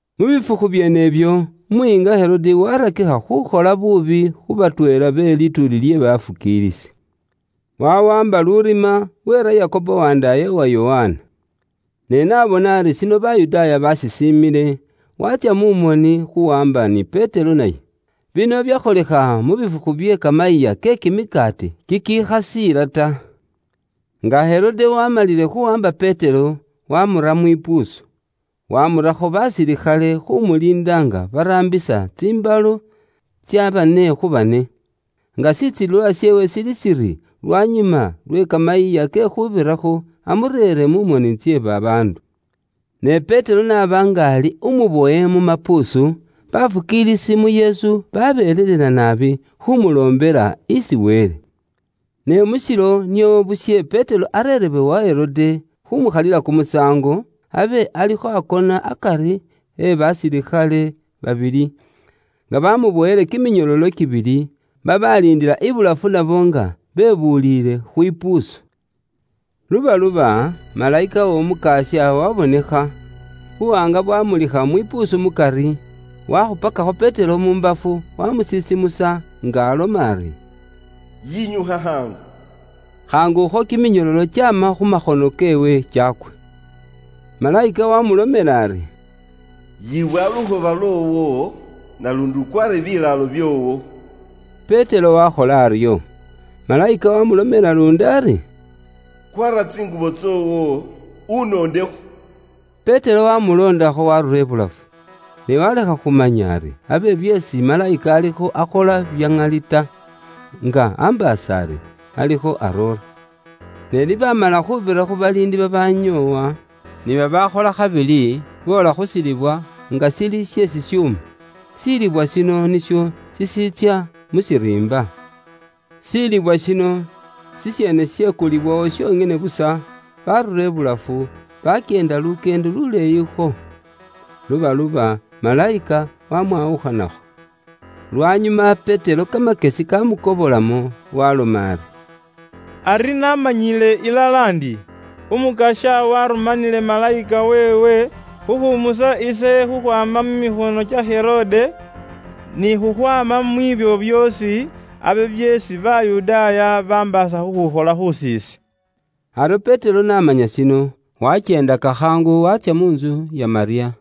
Mu bifukhu byeenebyo, umuyiinga Herode waarakikha khuukhola buubi khu batweela be lituuli lye bafukiilisi. Wawaamba lurima, weera Yakobo wandaaye wa Yokana. Ne n'abona ari shino Bayudaaya baashisiimile, waatsya mu moni khuwaamba ni Petero naye. Bino byakholekha mu bifukhu bye kamayiiya ke kimikaati kikikhasiila ta. Nga Herode waamalile khuwaamba Petero, waamura mwipuusu, waamurakho basilikhale khuumuliinda nga baraambisa tsimbalo tsya bane khu bane, nga shitsilililwa sheewe shili shiri lwanyuma lwe Kamayiiya ke Khuubirakho, amureere mu moni tse babaandu. Ne Petero n'aba nga ali umubowe mu mapuusu, bafukiilisi mu Yesu babelelela naabi khumuloombela isi Wele. Ne mu shilo nio bushe Petero areerebwe wa Herode khuumukhalila kumusaango, abe alikho akona akari e basilikhale babili, nga baamuboyile ni kiminyololo kibili, babaaliindila ibulafu nabo nga bebuliile khwipuusu. Lubaluba, malayika w'Omukasya waabonekha, buwaanga bwaamulikha mwipuusu mukari, waakhupakakho Petero mu mbafu, waamusisimusa, nga aloma ari, “Yinyukha khaangu.” Khaangukho kiminyololo kyaama khu makhono keewe kyaakwa. Malayika waamulomela ari, “Yibowa lukhoba lwoowo, naluundi ukwaare bilaalo byoowo.” Petero waakhola aryo. Malayika waamulomela luundi ari, “Kwaara tsingubo tsoowo, unondekho.” Petero waamuloondakho waarura ibulafu. Ne waalekha khumanya ari abe byeesi malayika alikho akhola bya ŋali ta, nga ambaasa ari alikho aroora. Ni baamala khuubira khu baliindi babaanyoowa, ni babaakhola khabili boola khu shilibwa nga shili she shishuuma. Shilibwa shino nisho shishiitsya mu shiriimba. Shilibwa shino shisheene sheyikulawo shonyene busa, barura ibulafu, bakyeenda lukyeendo luleeyikho. Lubaluba, malayika wamwawukhanakho. Lwanyuma Petero kamakyesi kaamukobolamo waaloma ari, “Ari naamanyiile ilala ndi Umukasya waarumanile malayika weewe khukhuumusa ise khukhwaama mu mikhono kya Herode, ni khukhwaama mwiibyo byoosi abe byeesi Bayudaaya bambaasa khukhukhola khus'ise.” Aryo Petero n'amanya shino, wakyeendaka khaangu waatsya mu ntsu ya Malyamu,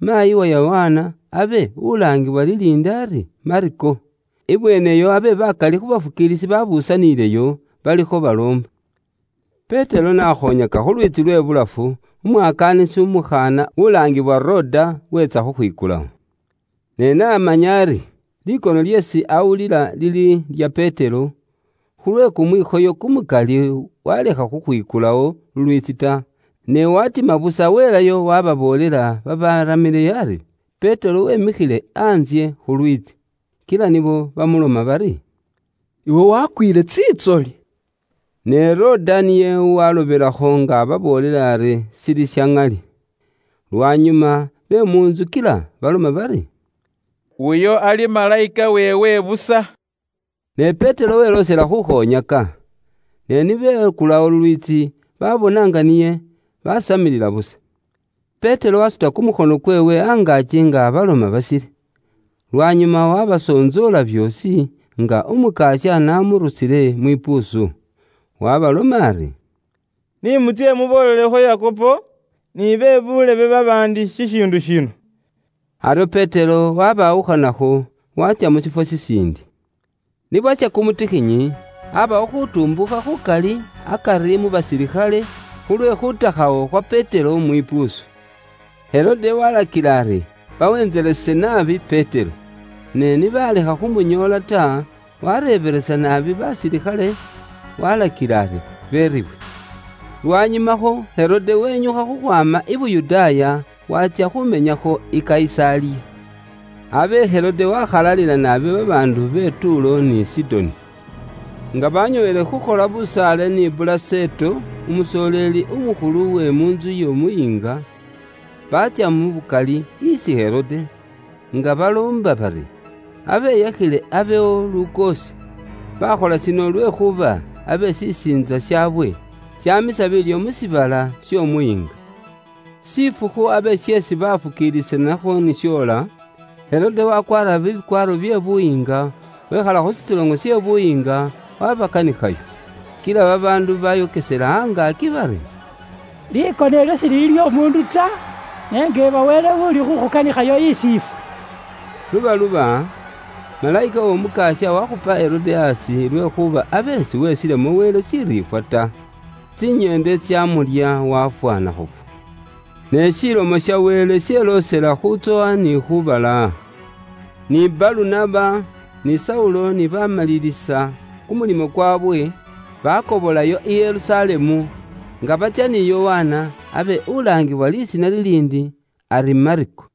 maayi wa Yokana, abe ulaangiwa liliindi ari Mako. Ibweeneyo abe bakali khu bafukiilisi babusanileyo balikho baloomba. Petero n'akhoonyaka khu lwiitsi lwe bulafu, umwakaanisi umukhaana ulaangiwa Roda weetsa khukhwikulawo kumulyaango. Ne n'amanya ari likono lyeesi aawulila liri lya Petero, khulwe kumwikhoyo kumukali waalekha khukhwikulawo kumulyaango ta, ne waatima busa weelayo waaboolela babaramile ari Petero weemikhile antsye khu lwiitsi. Kila nibo bamuloma bari, “Iwe wakwiile tsintsoli.” Ne Roda niye waalobelakho nga ababoolela ari shili sha ŋali. Lwanyuma be mu ntsu kila baloma bari, “Uyo ali malayika weewe busa.” Ne Petero weloosela khuukhoonyaka. Ne ni bekulawo lulwiitsi baabona nga niye, baasamilila busa. Petero waasuta kumukhono kweewe angaaki nga abaloma basile. Lwanyuma waabasontsoola byoosi, nga Umukasya n'amurusile mwipuusu. Waabaloma ari “Ni mutsye muboolelekho Yakobo ni be buulebe babaandi shishiindu shino.” Aryo Petero waabawukhanakho, waatsya mu shifwo shishiindi. Ni bwasha kumutikhinyi, aabawo khuutumbuukha khukali akari mu basilikhale khulwe khuutakhawo khwa Petero mwipuusu. Herode waalakila ari bawentselese naabi Petero. Ne ni baalekha khumunyoola ta, waareebelesa naabi basilikhale, waalakila ari beeribwe. Lwanyumakho Herode wenyukha khukhwaama i Buyudaaya, waatsya khuumenyakho i Kayisaliya. Abe Herode waakhalalila naabi babaandu be Tuulo ni Sidoni. Nga baanyooyile khukhola busaale ni Bulaseto umusoleeli umukhulu uwe mu ntsu y'omuyiinga, baatsya mu bukali isi Herode, nga baloomba bari abeyakhile abewo lukoosi. Baakhola shino lwekhuuba abe shisiintsa shaawe shamisa biilyo mu shiibala sh'omuyiinga. Shifukhu abe sheesi baafukiilisanakho ni shoola, Herode wakwaara bikwaaro bye buyiinga, wekhala khu shitsoloŋo she khukhalilakho kimisaango, wabakanikhayo. Kila babaandu bayokesela angaaki bari, “Likono ilyo shilili ly'omuundu ta, ne njeeba wele uli khukhukanikhayo isi ifwe.” Lubaluba, malayika w'Omukasya wakhupa Herode aasi lwekhuuba abe siwesilemo Wele shiriifwa ta. Tsinyeende tsaamulya waafwa nakhufwa. Ne Ilomo ya Wele yeloosela khuutsowa ni khuubalaaha. Ni Balunaba ni Saulo ni baamalilisa kumulimo kwaabwe, baakobolayo i Yerusalemu, nga batsya ni Yokana, abe ulaangibwa lisiina liliindi ari Mako.